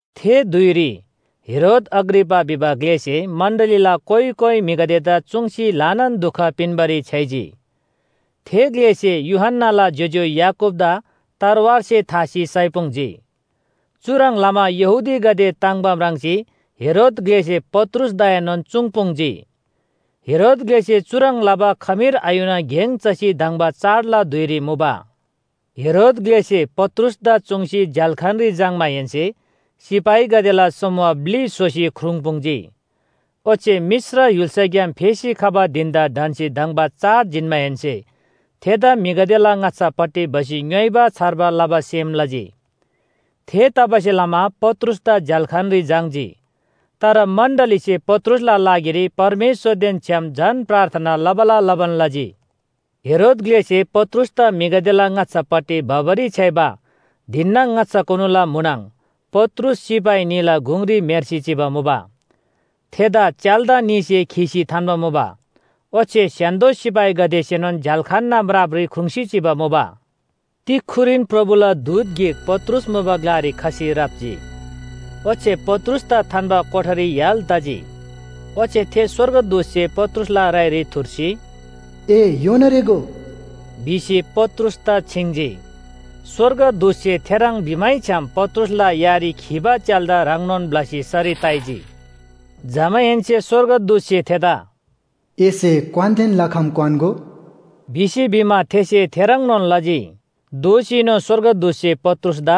थे धुइरी हेरोद अग्रिपा भिबा ग्‍लेसे मण्‍डलीला कोइ कोइ म्‍हिगदेदा चुङ्सी ल्‍हानान दुख पिन्‍बारी छ्‌याइजी। थे ग्‍लेसे यूहन्‍नाला ज्‍योज्‍यो याकूबदा तरवारसे थासी साइपुङ्जी। चुह्रङ् लमा यहूदीगदे ताङ्‍बा म्राङ्सी हेरोद ग्‍लेसे पत्रुसदाएनोन चुङ्‌पुङ्‌जी। हेरोद ग्‍लेसे चुह्रङ् लबा खमीर आयुना गेङ चसी धङ्बा चाडला धुइरी मुबा। हेरोद ग्‍लेसे पत्रुसदा चुङ्सी झ्‍याल्‍खानरी झाङ्‌माहेन्‍से सिपाहीगदेला समूह ब्‍लि स्‍होसी ख्रुङ्पुङ्जी। ओच्‍छे मिश्र य्‍हुल्‍साग्‍याम फेसी खबा धिन‍दा ढन्‍सी धङ्बा चाड जिन्‍माहेन्‍से थेदा म्‍हिगदेला ङाच्‍छापट्टि भसी ङ्‌योइबा छार्बा लबा सेम लजी। थेतबासेलमा पत्रुसदा झ्‍याल्‍खानरी झाङ्‌जी, तर मण्‍डलीसे पत्रुसला लागिरी परमेश्‍वरदेन छ्‌याम झन प्रार्थना लबाला लबान लजी। हेरोद ग्‍लेसे पत्रुसदा म्‍हिगदेला ङाच्‍छापट्टि भबारी छ्‌याइबा धिनना ङाच्‍छाकुनुला म्‍हुनङ, पत्रुस सिपाही न्‍हीला गुङरी म्‍हेर्सी चिबा मुबा, थेदा च्‍याल्‍दा न्‍हीसे खीसी थान्‍बा मुबा। ओच्‍छे स्‍य्‍हान्‍दो सिपाहीगदेसेनोन झ्‍याल्‍खानना म्रापरी ख्रुङ्‌सी चिबा मुबा। तिक्‍खुरीन प्रभुला दूत गिक पत्रुस मुबा ग्‍लारी खसी राप्‍जी, ओच्‍छे पत्रुसदा थान्‍बा कोठारी य्‍हाल तजी। ओच्‍छे थे स्‍वर्गदूतसे पत्रुसला राइरी थुर्सी, “ए योना रेःगो” भिसी पत्रुसदा छिङ्जी। स्‍वर्गदूतसे थेह्रङ् भिमैछ्‌याम पत्रुसला यारी खीबा च्‍याल्‍दा ह्रङ्नोन ब्‍लसी सरी ताइजी। जमाहेन्‍से स्‍वर्गदूतसे थेदा “एसे क्‍वानदेन लखम क्‍वान्‍गो” भिसी भिमा थेसे थेह्रङ्नोन लजी। दोःसीनोन स्‍वर्गदूतसे पत्रुसदा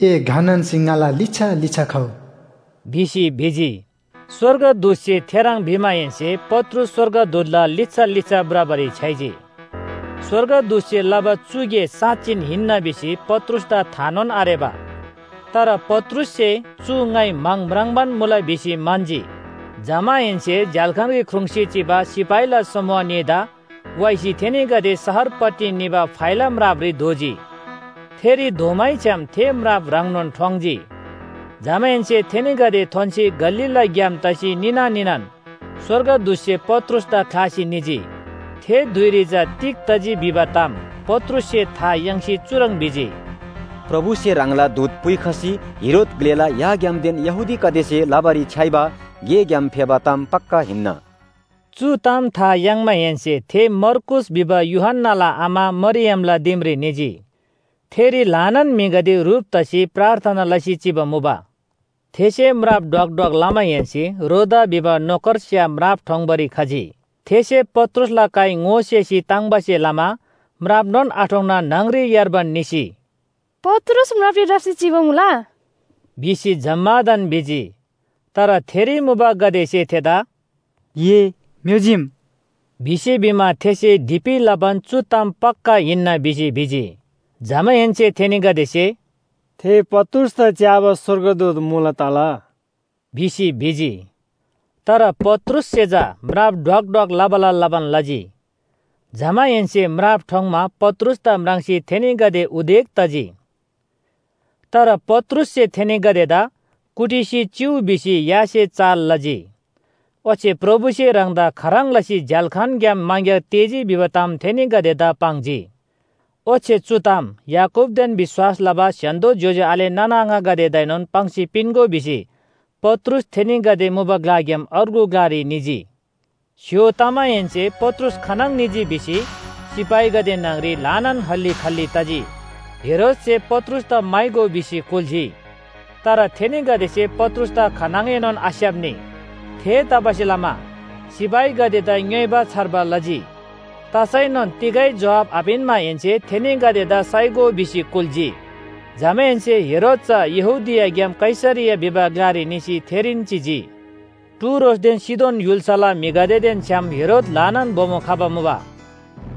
“ए घ नान्‍सी ङाला लिच्‍छा लिच्‍छा खउ” भिसी भिजी। स्‍वर्गदूतसे थेह्रङ् भिमाहेन्‍से पत्रुस स्‍वर्गदूतला लिच्‍छा लिच्‍छा भ्रबारी छ्‌याइजी। स्‍वर्गदूतसे लबा चु गे साँच्‍चिन हिन्‍ना भिसी पत्रुसदा थानोन आरेबा। तर पत्रुससे चु ङाइ म्‍हाङ म्राङ्बान मुला भिसी म्‍हन्‍जी। जमाहेन्‍से झ्‍याल्‍खानरी ख्रुङ्‌सी चिबा सिपाहीला समूह न्‍हीदा वाइसी थेनीगदे शहरपट्टि निबा फाइला म्रापरी धोजी, थेरी धोमैछ्‌याम थे म्राप ह्रङ्नोन ठोङ्‌जी, जमाहेन्‍से थेनीगदे थोन्‍सी गल्‍लीला ग्‍याम तसी निना निनान स्‍वर्गदूतसे पत्रुसदा ख्‍लासी निजी। थे धुइरी चा तिग तजी भिबा ताम पत्रुससे था याङ्सी चुह्रङ् भिजी, “प्रभुसे ह्राङला दूत पुइखसी हेरोद ग्‍लेला याग्‍यामदेन यहूदीगदेसे लबारी छ्‌याइबा गेग्‍याम फेबा ताम पक्‍का हिन्‍ना।” चु ताम था याङ्माहेन्‍से थे मर्कूस भिबा यूहन्‍नाला आमा मरियमला दिमरी निजी। थेरी ल्‍हानान म्‍हिगदे ह्रुप तसी प्रार्थना लसी चिबा मुबा। थेसे म्राप ढ्वक ढ्वक लमाहेन्‍से रोदा भिबा नोकरस्‍या म्राप ठोङ्‌बारी खजी। थेसे पत्रुसला काइ ङोसेसी ताङ्बासे लमा म्रापनोन आठोङ्‌ना न्‍हङरी यार्बान निसी, “पत्रुस म्रापरी राप्‍सी चिबा मुला” भिसी जम्‍मादान भिजी। तर थेरी मुबागदेसे थेदा “ए म्‍योजीम” भिसी भिमा थेसे ढीपि लबान चु ताम पक्‍का हिन्‍ना भिसी भिजी। जमाहेन्‍से थेनीगदेसे “थे पत्रुसदा च्‍याबा स्‍वर्गदूत मुला तला” भिसी भिजी। तर पत्रुससे चा म्राप ढ्वक ढ्वक लबाला लबान लजी। जमाहेन्‍से म्राप ठोङ्‌मा पत्रुसदा म्राङ्सी थेनीगदे उदेक तजी। तर पत्रुससे थेनीगदेदा “कुटिसी चिउ” भिसी यासे चाल लजी, ओच्‍छे प्रभुसे ह्राङदा खाह्रङ् लसी झ्‍याल्‍खानग्‍याम मङग्‍यार तेःजी भिबा ताम थेनीगदेदा पाङ्जी। ओच्‍छे चु ताम याकूबदेन विश्‍वास लबा स्‍य्‍हान्‍दो ज्‍योज्‍यो आले नाना आङागदेदाएनोन पाङ्सी पिन्‍गो भिसी पत्रुस थेनीगदे मुबा ग्‍लाग्‍याम अर्गु ग्‍लारी निजी। स्‍य्‍हो तमाहेन्‍से पत्रुस खानङ निजी भिसी सिपाहीगदे न्‍हङरी ल्‍हानान हल्‍ली खल्‍ली तजी। हेरोदसे पत्रुसदा म्‍हाइगो भिसी कुल्‍जी। तर थेनीगदेसे पत्रुसदा खानङएनोन आस्‍याप्‍नी। थेतबासेलमा सिपाहीगदेदा ङ्‌योइबा छार्बा लजी, तसैनोन तिगै जोहाब आपिन्‍माहेन्‍से थेनीगदेदा साइगो भिसी कुल्‍जी। जमाहेन्‍से हेरोद चा यहूदियाग्‍याम कैसरिया भिबा ग्‍लारी निसी थेरीन चिजी। टुरोसदेन सीदोन य्‍हुल्‍साला म्‍हिगदेदेन छ्‌याम हेरोद ल्‍हानान बोमो खबा मुबा।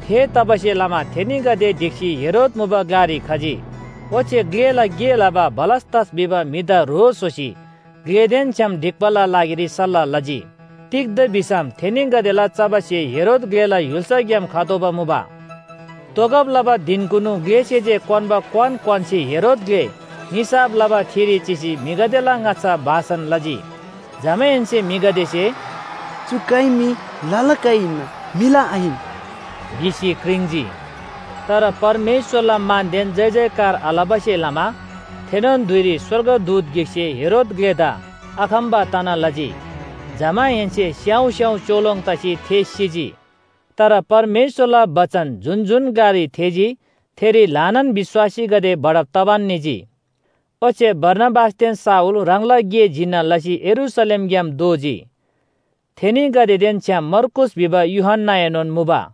थेतबासेलमा थेनीगदे ढिक्‍सी हेरोद मुबा ग्‍लारी खजी, ओच्‍छे ग्‍लेला गे लबा बलस्‍तस भिबा म्‍हिदा ह्रो स्‍होसी ग्‍लेदेन छ्‌याम ढिक्‍बाला लागिरी सल्‍लाह लजी। तिग्‍दा भिसम थेनीगदेला चबा स्‍हे हेरोद ग्‍लेला य्‍हुल्‍साग्‍याम खतोःबा मुबा। तोगब लबा धिनकुनु ग्‍लेसे जे क्‍वान्‍बा क्‍वान क्‍वान्‍सी हेरोद ग्‍ले निसाफ लबा ठिरी चिसी म्‍हिगदेला ङाच्‍छा भाषण लजी। जमाहेन्‍से म्‍हिगदेसे “चु काइ मी लला काइ हिन्‍ना, म्‍हिला आहिन!” भिसी क्रिङ्‌जी। तर परमेश्‍वरला मानदेन जयजयकार आलबासे लमा थेनोन धुइरी स्‍वर्गदूत गिकसे हेरोद ग्‍लेदा आखम्‍बा तना लजी, जमाहेन्‍से स्‍याउँ स्‍याउँ च्‍योलोङ तसी थे सिजी। तर परमेश्‍वरला बचन जुन जुन ग्‍लारी थेःजी थेरी ल्‍हानान विश्‍वासीगदे बढब तबान निजी। ओच्‍छे बारनाबासदेन शाऊल ह्राङला गे जिन्‍ना लसी यरूशलेमग्‍याम दोःजी। थेनीगदेदेन छ्‌याम मर्कूस भिबा यूहन्‍नाएनोन मुबा।